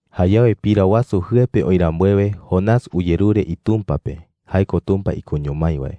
Jayawe pira wasu jɨe pe oï rambuewe, Jonás uyerure iTumpa pe – jae ko Tumpa ikoño mái wae. (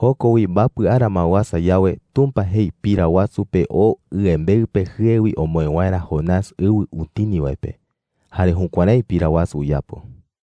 Joko wi mbapɨ ara ma uasa yawe, Tumpa jei pira wasu pe oo ɨembeɨ pe jɨe wi omoë waerä Jonás ɨwɨ utini wae pe. Jare jukuärái pira wasu uyapo.